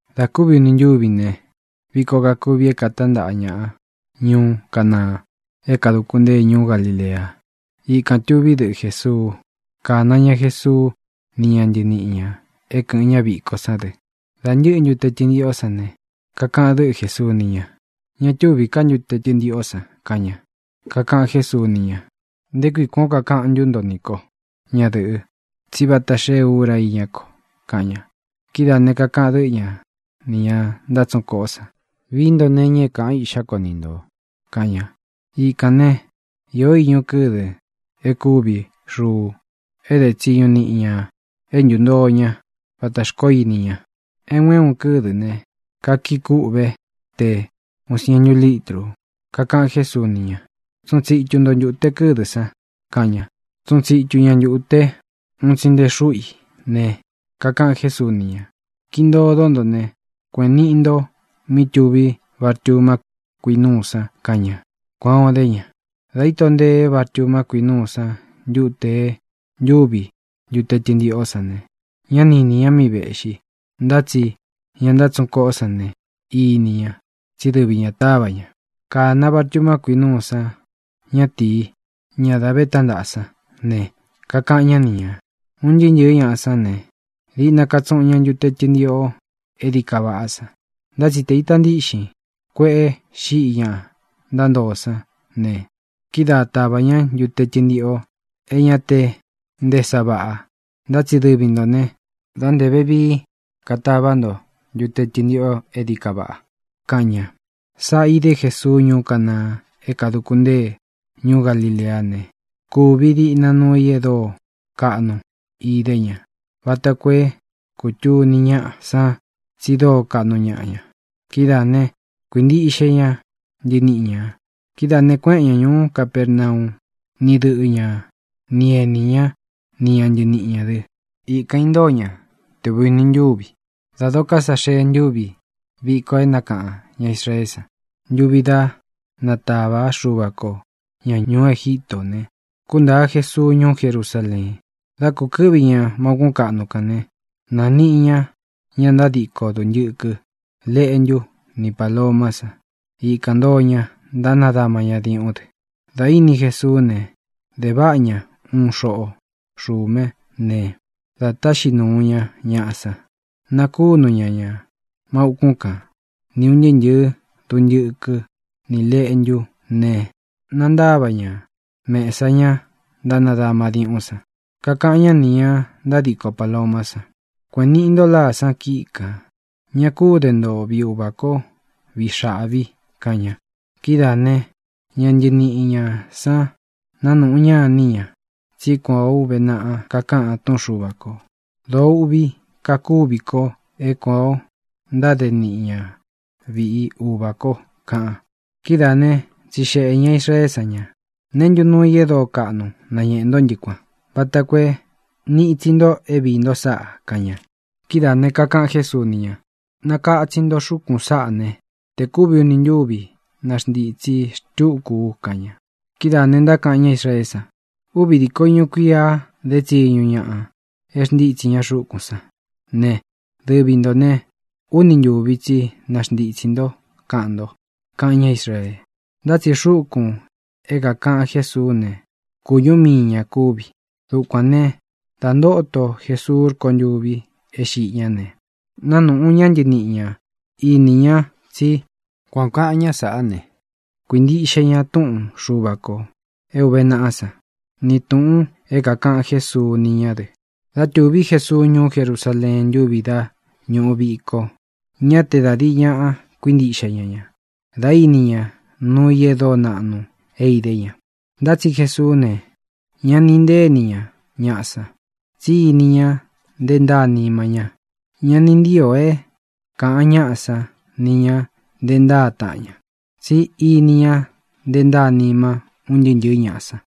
Dā kúvi uni ntúvi ne, viko kakuvi é katántaꞌa ñaꞌa ñuú Canaa é kāduku ntée ñuú Galilea. Ikān tuví dɨꞌɨ Jēsuu. Kāna ña Jesuu ni ña ntɨníꞌi ñā é kɨ̄ꞌɨn ña víko sán dɨ. Dā ntɨ́ꞌɨ ntute tɨntiꞌō sán ne, kakaꞌan dɨ́ꞌɨ Jēsuu ni ña: —Ña túvī ká ntute tɨntiꞌō san —kaꞌan ña. Kakaꞌan Jésuu ni ña: —¿Nté kui kuān ó kakaꞌan ntú nto nī kó, ñadɨ̄ꞌɨ, tsí vata xée ura i íñá ko? —kaꞌan ña. Kidáā ne, kakaꞌan dɨ́ꞌɨ ña nī ña ntátsuꞌun koꞌo san: —Vií nto nee iña é kāꞌan iꞌxá ko ni ntō —kaꞌan ña. Ikān ne, īó iñu kɨdɨ é kūvi xuu, e dé tsiñu niꞌi ña e ntúntoo ña vatā xkoó ini ña. É un é un kɨ́dɨ̄ ne, kakii kúꞌve te uun siēntu lítru. Kakaꞌan Jésuu ni ña: —Tsuꞌun tsitu nto ntūte kɨ́dɨ san —kaꞌan ña. Tsuꞌun tsitu ña ntūte un tsi nte xúꞌu i ne, kakaꞌan Jésuu ni ña: —Kiꞌi ntodó nto ne, kueꞌēn niꞌi nto mí tuví vartuma kuinúu san —kaꞌan ña. Kuān o dé ña. Dā íto ntee vartuma kuinúu sán ntute e ntúvi ntute tɨntiꞌō sán ne, ñá ni inī ña míꞌi vēꞌxi. Ntá tsi ña ntátsuꞌun koꞌo sán ne, ini ña, tsí dɨvi ñā táva ña. Kāna vartuma kuinúu san ñatīi, ñá dā ve tántaꞌa sán ne, kakaꞌan ñá ni ñā: —Un ntɨɨ́ ntɨ̄ɨ́ ñaꞌa sán ne, diꞌna katsuꞌun ña ntute tɨntiꞌō é dií ka vaꞌá san. Ntá tsi te īta ntíꞌxin kueꞌe xiꞌi ña ntántoo sán ne, kidáā táva ña ntute tɨntiꞌō é ña te nté sa vaꞌa. Ntá tsi dɨvi ntō ne, dá ntē vevií katavá nto ntute tɨntiꞌō é dií ka vaꞌa —kaꞌan ña. Sáꞌa īdé Jesuu ñuú Canaa é kāduku ntée ñuú Galileá ne, kūvi diꞌna nuu i e dóo kaꞌnu idé ña vata koo é kūtuni ñáꞌa san tsi dóo kaꞌnu ñaꞌa ña. Kidáā né, kuīntiꞌxe ña ntɨniꞌi ñā. Kidáā ne, kuéꞌen ña ñūú Capernau ni dɨꞌɨ ña ni enī ñá, ni ña ntɨniꞌi ñā dɨ. Ikān intóo ña te ūvi uni ntúvi. Dā doko sá xee ntuvi viko e nákaꞌan ña Israeé san ntuvi da nátāvá Xuva ko ñā ñuú Egítō ne, kúntāa Jesuu ñuú Jerusaleen. Dā kukɨ́ꞌvi ñā má ūkún kaꞌnu kān né, nāniꞌi ña ña ntádiko duntɨkɨ, leꞌntú, ni pālomá san. Ikān ntoo ña ntánadama diuꞌún dɨ. Dā íni Jesuú ne, de váꞌa ña uun xoꞌo xume ne, dā táꞌxi nūu ña ñaꞌā sán, nakúnu ña ñā má ūkún kan, ni ūn ntɨɨ́ ntɨ̄ɨ duntɨkɨ́ ni lēꞌntú ne, nantáva ña mēsa ñá ntánadama diuꞌún san. Kakaꞌan ñá nī ña ntádiko pālomá san: —Kueꞌēn niꞌi nto láa san kíꞌi kān. Ña kú de nto viꞌi Uvā kó viꞌi xáꞌvī —kaꞌan ña. Kidáā né, ña ntɨniꞌi ñā san nánūꞌu ña iní ña tsí kuān ó uve naꞌa kakaꞌan túꞌun Xuva kō: “Dōo uꞌvi kakúvi ko é kuān ó ntáde niꞌi ña viꞌi Uvā ko”, kaꞌan. Kidáā ne, tsixeꞌē ña Israeé san ña: —¿Neé ntu nuu i e dóo kaꞌnu nañéꞌe ntó ntɨ kuān, vata koo é nīꞌi itsi nto é viī nto sáꞌa? —kaꞌan ña. Kidáā ne, kakaꞌan Jésuu ni ña: —Nakatsin nto xúkūn saꞌá ne, tē kúvi uni ntúvi naxntītsi xtúku u —kaꞌan ña. Kidáā ne, ntákaꞌan ñá Israeé san: —Úvi dīko iñu kuia dé tsiñu ñaꞌa e xntítsi ña xúkūn sán ne, dɨvī ntó ne, úni ntuvi tsi naxntitsī ntó, kaꞌan nto —kaꞌan ñá Israee. Ntá tsi xúkūn é kākaꞌan Jésuú ne, kūñú mii ñā kúvi. Dukuān né, dā ntóto Jesuu rkontûvi é xiꞌi ñá ne, nánuꞌu ña ntɨniꞌi ña inī ña tsí kuan ō kaꞌan ñá saꞌá ne, kuīntiꞌxe ña túꞌun Xuva kō é ūve naꞌá san, ni tūꞌun é kākaꞌan Jésuu ni ñá dɨ. Dá tūví Jesuu ñuú Jerusaleen ntuvi dá ñuꞌu viko, ñá te da dīi ñaꞌa kuíntiꞌxe ña ña dá ini ña nuu i e dóo naꞌnu é idé ña. Ntá tsi Jesuú ne, ñá ni intée ini ña ñaꞌa san, tsí ini ña nte ntáa nima ña. Ña ni ntío é kāꞌan ñáꞌa san ni ñā nte ntáa taꞌan ña, tsí ini ña nté ntaa nima ún ntɨɨ́ ntɨ̄ɨ́ ñaꞌa san.